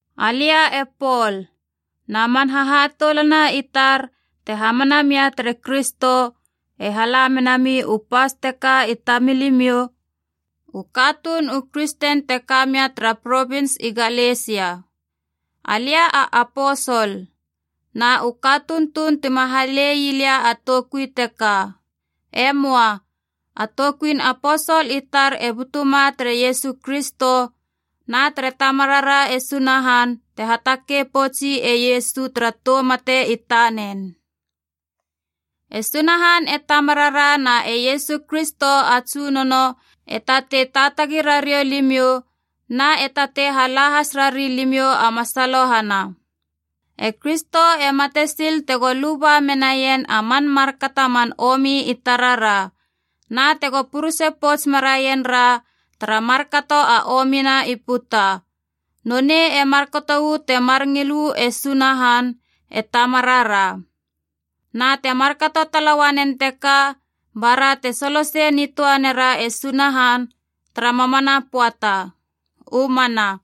Alia e Pol, na man hahatoulana i tar te hamana mia tere Kristo, e hala menami u pas teka i tamilimiou u katuun u kristen te ka mia tara provins i Galesia. Alia a aposol. Na u katuun tuun tima halei lia a toukui teka. E möa. A toukuin aposol i tar e butuma tere Iesu Kristo na tere Tamarara e Sunahan te hatakei poutsi e Iesu tara tou mate i tanen. E Sunahan e Tamarara na e Iesu Kristo a Tsunono e tatei taatagi rariou limiou na e tatei hala has rari limiou a masalohana. E Kristo e mate sil tego luba menaien a man markato a man omi i tarara, na tego purese pouts meraien ra tara markato a omina i puta. Nonei e markato uu temar ngil uu e Sunahan e Tamarara. Na te markato tala uanen teka bara te solo sei nitöa nera e Sunahan tara mamana pöata! U mana.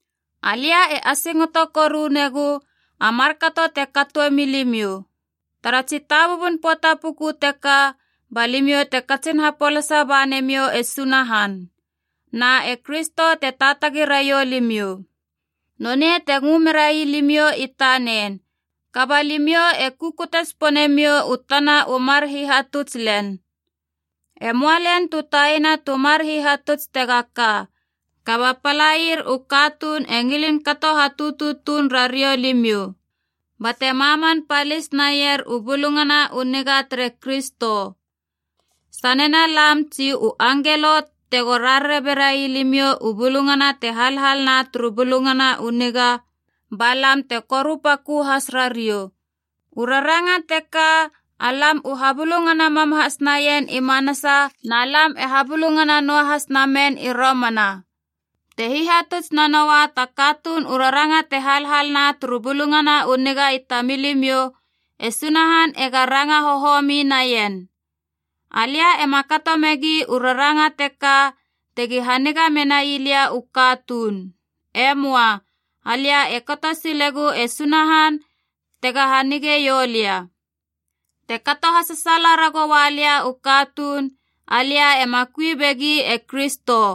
Alia e asingoto koru negu a markato te katoe milimiou! Tara tsitabubun pöata puku teka ba limiou te katsin hapolasa bane miou e Sunahan, na e Kristo te taatagi raiou limiou. Nonei te ngö merai limiou i tanen, kaba limiou e kukute tsipone miou u tana u mar hihatuts len. E möa len tu taina tu mar hihatuts tega ka, kaba palair u katuun e ngilin kato hatutu tuun rariou limiou bate maman palis naier u Bulungana u Niga tere Kristo. Sanena lam tsi u angelo tego rarare berai limiou u bulungana te halhal na turu Bulungana u Niga, balam te korupakö has rariou. U raranga teka alam u habulungana mam has naien i manasa na alam e habulungana noahas namen i romana: te hihatuts nanoua ta katuun u raranga te halhal na turu Bulungana u Niga i tamilimiou, e Sunahan ega ranga hohomi naien. Alia ema kato megi u raranga teka tegi haniga menai lia u katuun. Emoa. Alia e kato silegu e Sunahan tega hanigeiou lia. Te kato hasasaala ragoua lia u katuun, alia ema kui begi e Kristo.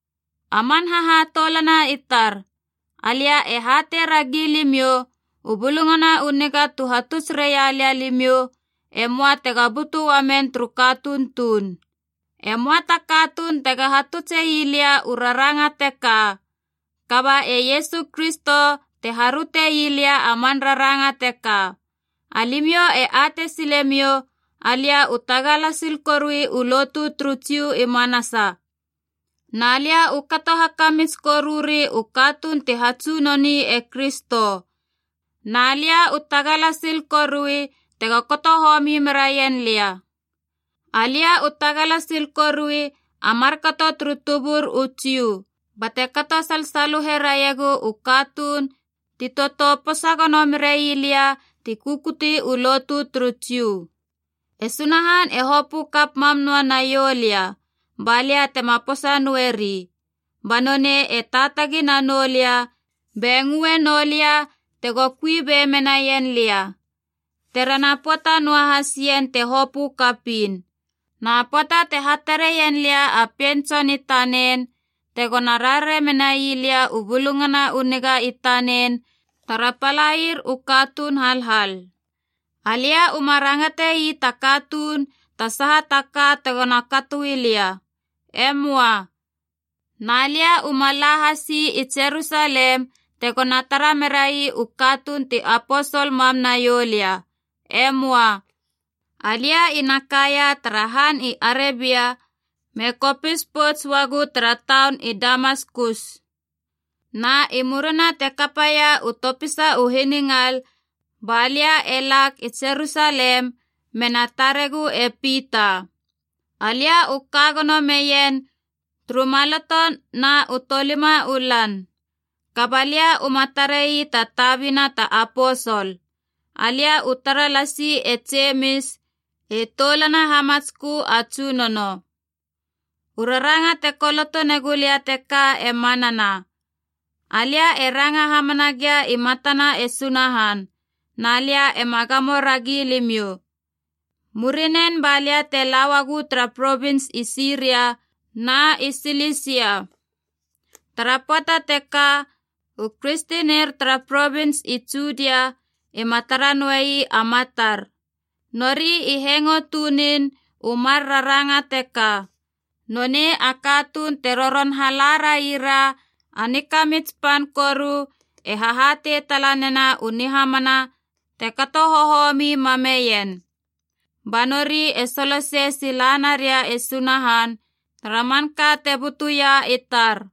A man hahatoulana i tar, alia e hatei ragi limiou, u Bulungana u Niga tu hatuts railia limiou, e möa tega butu uamen turu katuun tuun. E möa ta katuun tega hatutse ii lia u raranga teka. Kaba e Iesu Kristo te haröte ii lia a man raranga teka. Alimiou e atei silemiou alia u tagala sil korui u lotu turu Jiu i manasa. Na lia u kato hakamits koruri u katuun ti hatsunoni e Kristo, na lia u tagala sil korui tego kato homi meraien lia. Alia u tagala sil korui a markato turu tubur u Jiu, bate kato salsaluhe raiegu u katuun ti totou posa gono merai lia ti kukuti u lotu turu Jiu. E Sunahan e hopö kap mam noa naiou lia, ba lia tema posa noeri. Ba nonei e taatagi nanou lia be ngöe noulia tego kui be menaien lia, terena pöata noahas ien te hopö kapiin. Na pöata te hatareien lia a Pien Tson i tanen, tegona rarare menai lia u Bulungana u Niga i tanen tara palaier u katuun halhal, alia uma rangatei ta katuun ta saha taka tegona katoi lia. E möa. Na lia uma la hasi i Jerusalem tegona tara merai u katuun ti aposol mam naiou lia. E möa. Alia ina kaia tara han i Arebia me hakopis pouts uagu tara taun i Damaskus. Na i murina te kapaia u topisa u hiningal ba lia e lag i Jerusalem mena taregu e Pita. Alia u ka gono meien turu maloto na u tolima u lan. Kaba lia uma tarei ta tabina ta aposol. Alia u tara lasi e Jemis e toulana hamatskö a Tsunono. U raranga te koloto negu lia teka e manana. Alia e ranga hamana gia i matana e Sunahan, na alia ema gamo ragi limiou. Murinen balia e la uagu tara provins i Siria na i Silisia. Tara pöata teka u kristenir tara provins i Judia ima tara noei a matar. Nori i hengo tunin u mar raranga teka, “Nonei a katuun te roron hala raira a nikamits pan koru e hahatei tala nena u nihamana te kato hohomi mameien.” Ba nori e solosei sila naria e Sunahan, tara manka te butuia i tar.